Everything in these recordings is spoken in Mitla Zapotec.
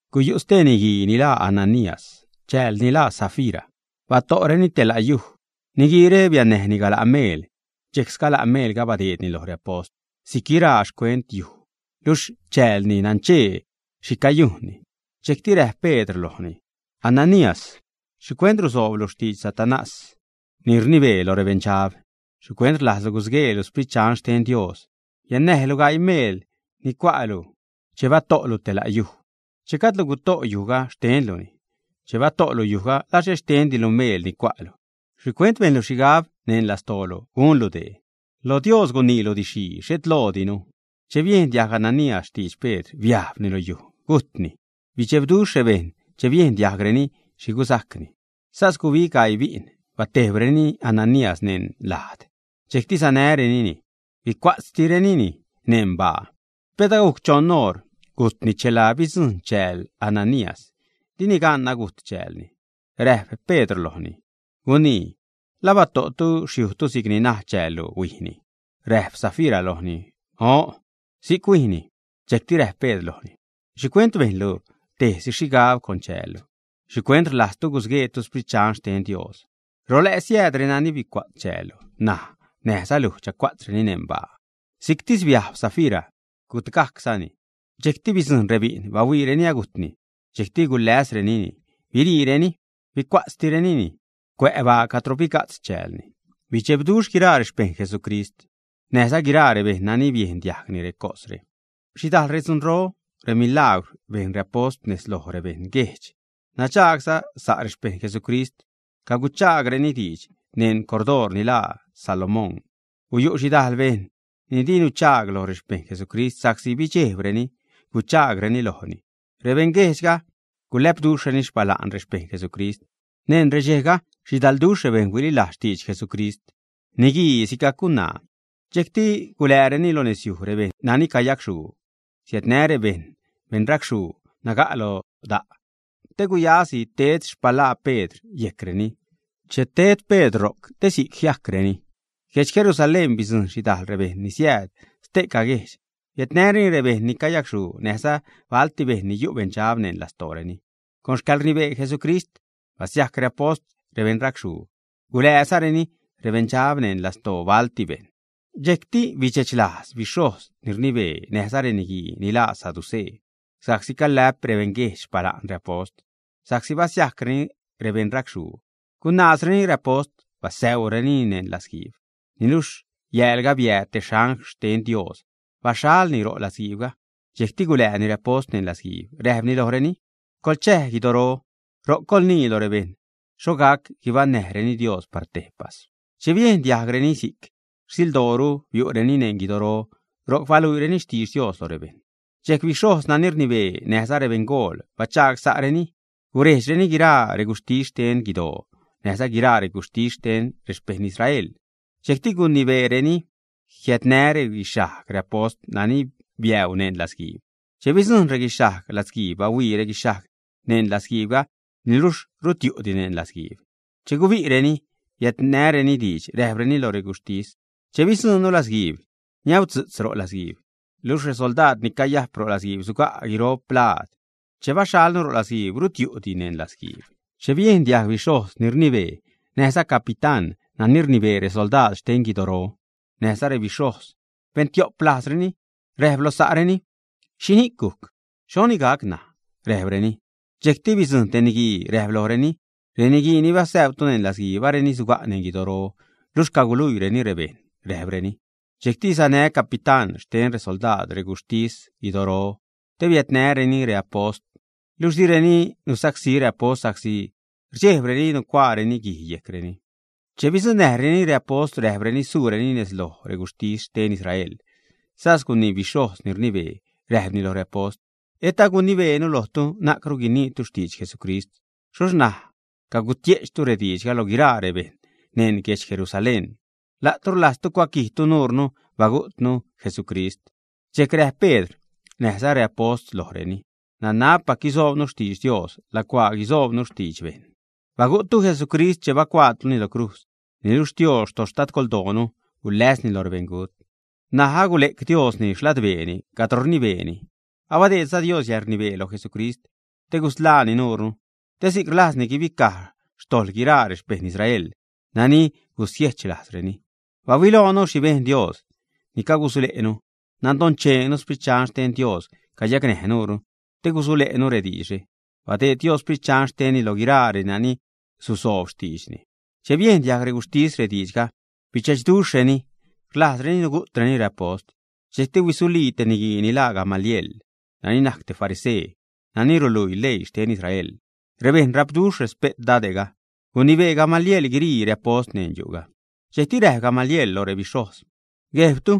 Guyu' stee niguii ni laa Ananías. Chäälni laa Safira. Bato'reni te la' yuj. Niguiire biannäjni gala' meel, dxejc sgala' meelga badeedni lo reapost si'c guiraa xcuent yujga luxh chäälni nanchee xhi cayujnni. Dxejcti räjp Pedr lojni: ―Ananías, ¿xhicuent rusooblu xtidx Satanás ni rnibee lo rebeṉdxab, ä? ¿Xhicuent rlajzlu gusgueelu Sprit Dxan xten Dios? Biannäjlu gaii meel ni cua'lu che bato'lu te la' yuj. Che gajdlu guto' yujga, xtenluni. Che bato'lu yujga, ¿la xhet xtendilu meel ni cua'lu? ¿Xhicuent bejnlu xhigab neṉ lastoolu gunlu dee? Loj Dios guniilu didx-xhii, xhet loodinu. Che biejn diajg Ananías xtidx Pedr, biajbni lo yuj, gujtni. Bidxebduxh rebejṉ che biejn diajgreni xhi gusajcni. Sas gubig gaii bi'n batejbreni Ananías neṉ lajd. Dxejcti sanärenini huicua'tzrenini neṉ baa. Pet agujc choṉ oṟ gujtni chela bidzujṉ chääl Ananías. Dini gan agujt chäälni. Räjp Pedr lojni: ―Gunii, ¿la bato'tu xyujtu si'cni naj chäällu huijni, ä? Räjp Safira lojni: ―O'n, si'c huijni. Dxejcti räjp Pedr lojni: ―¿Xhicuent bejnlu tejsi xhigabguijdx con chäällu? ¿Xhicuent rlajztu gusgueetu Sprit Dxan xten Dios? Ro lä' siääd renani huicua'tz chäällu. N̲aj näjza luj chacua'tzreni neṉ baa. Si'ctis biajb Safira, gutgajczani. Dxejcti bidzujṉ rebi'n, bahuiireni agujtni. Dxejcti guläsrenini, biriireni huicuatzgajcrenini cuä' baa cadro biga'tz chäälni. Bidxebduxh guiraa rexpejṉ Jesucrist, näjza guiraa rebejṉ nani biejn diajgni recosre. Xhidajḻ redzunro, remilagwr bejn reapost nez loj rebeṉguejdx. Nadxaag sa' rexpejṉ Jesucrist, caguchaagreni diidx neṉ cordoor ni laa Salomón. Guyu' xhidajl bejṉ ni di nuchaag lo rexpejṉ Jesucrist sa'csi bidxejbreni guchaagreni lojreni. Rebeṉguejdxga guläpduxhreni xpala'n rexpejṉ Jesucrist. Neṉ redxejga xhidalduxh rebejṉ huililajz xtidx Jesucrist, niguii sigajc gunaa. Dxejcti gulääreni lo nezyuj rebejṉ nani cayacxhuu. Siädnä rebejṉ beṉracxhuu naga' lo da', te gaxäjsi ted xpalaa Pedr yejcreni che ted Pedr ro'c, te si'c jiajcreni. Guedx Jerusalén bidzujṉ xhidajl rebejṉ ni siääd ste'ca guejdx. Biädnäreni rebejṉ ni cayacxhuu näjza balti bejṉ ni yu' beṉdxab neṉ lastooreni. Con xcäḻrnibee Jesucrist basiajc reapost rebeṉ racxhuu, gulääzareni rebeṉdxab neṉ lastoo balti bejṉ. Dxejcti bidxechlajz bixhojz ni rnibee, näjza reniguii ni laa saducee, sa'csi calä'p rebeṉguejdx xpala'n reapost sa'csi basiajcreni rebeṉ racxhuu. Gunaazreni reapost. Basäurenini neṉ latzguiib. Niluxh yäälga, biääd te angl xten Dios, baxhalni ro' latzguiibga. Dxejcti gulääni reapost neṉ latzguiib. Räjpni lojreni: ―Coḻchäj guidoro. Ro'c coḻguinii lo rebejṉ xho gac guibaṉnäjreni Dios par tejpas. Che biejn diajgreni si'c, rsildooru biu'reni neṉ guidoro, ro'c baluiireni xtidx Dios lo rebejṉ. Dxejc bixhojz nani rnibee, näjza rebeṉgool, bachagsa'reni gurejdxreni guiraa reguxhtis xten guidoo, näjza guiraa reguxhtis xten rexpejṉ Israel. Dxejcti gunibeereni jiädnä reguixhajg reapost nani biäu neṉ ladtguiib. Che bidzujṉ reguixhajg latzguiib, bahuii reguixhajg neṉ latzguiibga, niluxh rut yu'di neṉ latzguiib. Che gubi'reni biädnäreni diidx, räjpreni loj reguxhtis: ―Che bidzuṉnu latzguiib, niäudzu'tz ro' latzguiib luxh resoldaad ni cayajp ro' latzguiib suga' guiro'p laad. Che baxhalnu ro' latzguiib, rut yu'di neṉ latzguiib. Che biejn diajg bixhojz ni rnibee, näjza capitán nani rnibee resoldaad xten guidoro, näjza rebixhojz, ben tio'p lajzreni, räjp lo sa'reni: ―¿Xhini'c gujc? ¿Xhoni gac ṉaj? ―räjpreni. Dxejcti bidzujṉ te niguii, räjpni lojreni: ―Reniguii ni basäutu neṉ latzguiib, areni suga' neṉ guidoro, luxh caguluiireni rebejṉ ―räjpni. Dxejcti sanä capitán xten resoldaad rexcuxhtis guidoro te biädnäreni reapost, luxh direni nusacsí reapost sa'csi rdxejbreni nucuaareni guij yejcreni. Che bidzuṉnäjreni reapost, räjpreni suureni nez loj reguxhtis xten Israel, sas gunii bixhojz ni rnibee, räjpni loj reapost: ―¿Et agunibeenu lojtu na'cru guiniitu xtidx Jesucrist? Xhoxh ṉaj cagutie'chtu rediidxga lo guiraa rebejṉ neṉ guedx Jerusalén. La'tu rlajztu cuaquijtu nuure bagu'tnu Jesucrist. Dxejc räjp Pedr näjza reapost lojreni: ―Nanabpac gusoobnu xtidx Dios, lacuaa gusoobnu xtidx bejṉ. Bagu'ttu Jesucrist che bacuaatuni lo crujz. Niluxh Xtios xtadgoldoonu guläsni lo rebeṉgut. N̲aj agule'c Diosni xladbeeni cadro rnibeeni, abadeedza Dios yäḻrnibee loj Jesucrist te gusḻaani nuure, te si'c rlajzni guibicaj xtojḻ guiraa rexpejṉ Israel nani gusiechlajzreni. Bahuiloonu xhi bejn Dios. Ni'c cagusule'nu. Nadoncheenu Sprit Dxan xten Dios cayacnäj nuure te gusule'nu rediidxre. Badeed Dios Sprit Dxan xtenni lo guiraa renani susoob xtiidxni. Che biejn diajg reguxhtis rediidxga, bidxechduxhreni, rlajzreni nugu'treni reapost. Dxejcti huisulii te niguii ni laa Gamaliel, nani najc te farisee nani ruluii leii xten Israel, rebejṉ rapduxh respe't dade'ga. Gunibee Gamaliel guirii reapost neṉ yu'ga. Dxejcti räjp Gamaliel lo rebixhojz: ―Guejbtu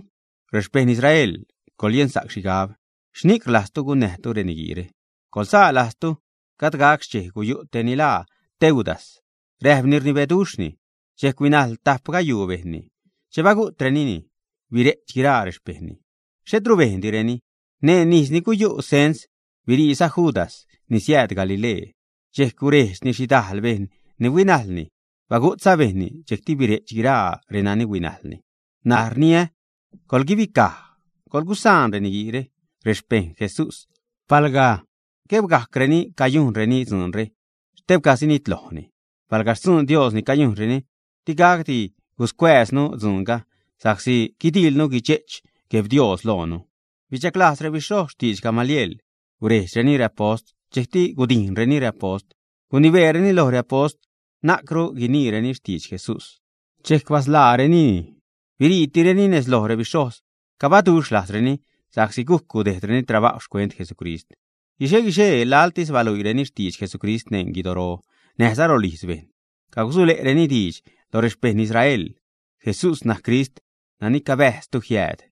rexpejṉ Israel, coḻyensa'c xhigab xhini'c rlajztu gunnäjtu reniguiire. Coḻzaa lajztu gajd gac xchej guyu' tej ni laa Teudas, räjpni rnibeduxhni. Dxejc huinajl tajp gayuu bejṉni. Che bagu'trenini, bire'ch guiraa rexpejṉni, xhetru bejndireni. Neṉ ijz ni guyu' cens, biriiza Judas ni siääd Galilee. Dxejc gurejdxni xhidajl bejṉ ni huinajlni. Bagu'tza bejṉni, dxejcti bire'chza guiraa reni huinajlni. N̲aj rniä, coḻguibicaj, coḻgusaan reniguiire, rexpejṉ Jesús. Palga guejbcareni cayujnreni dzuunre, xtebcani sinitlojni. Palga xtzuun Dios ni cayujnreni, digacdi guscuääznu dzuunga, sa'csi guidiḻnu guidxe'ch Gueb Dios loonu. Bichaglajz rebixhojz xtiidx Gamaliel. Gurejdxreni reapost, dxejcti gudijnreni reapost, gunibeereni loj reapost na'cru guiniireni xtidx Jesús. Dxejc basḻaarenini. Biriitireni nez loj rebixhojz. Cabaduxh lajzreni sa'csi gujc gudejdreni trabajw xcuent Jesucrist. Guixe-guixee laḻtis baluiireni xtidx Jesucrist neṉ guidoro näjza rolijz bejṉ. Cagusule'reni diidx lo rexpeṉ Israel: ―Jesús najc Crist nani cabääztu jiääd.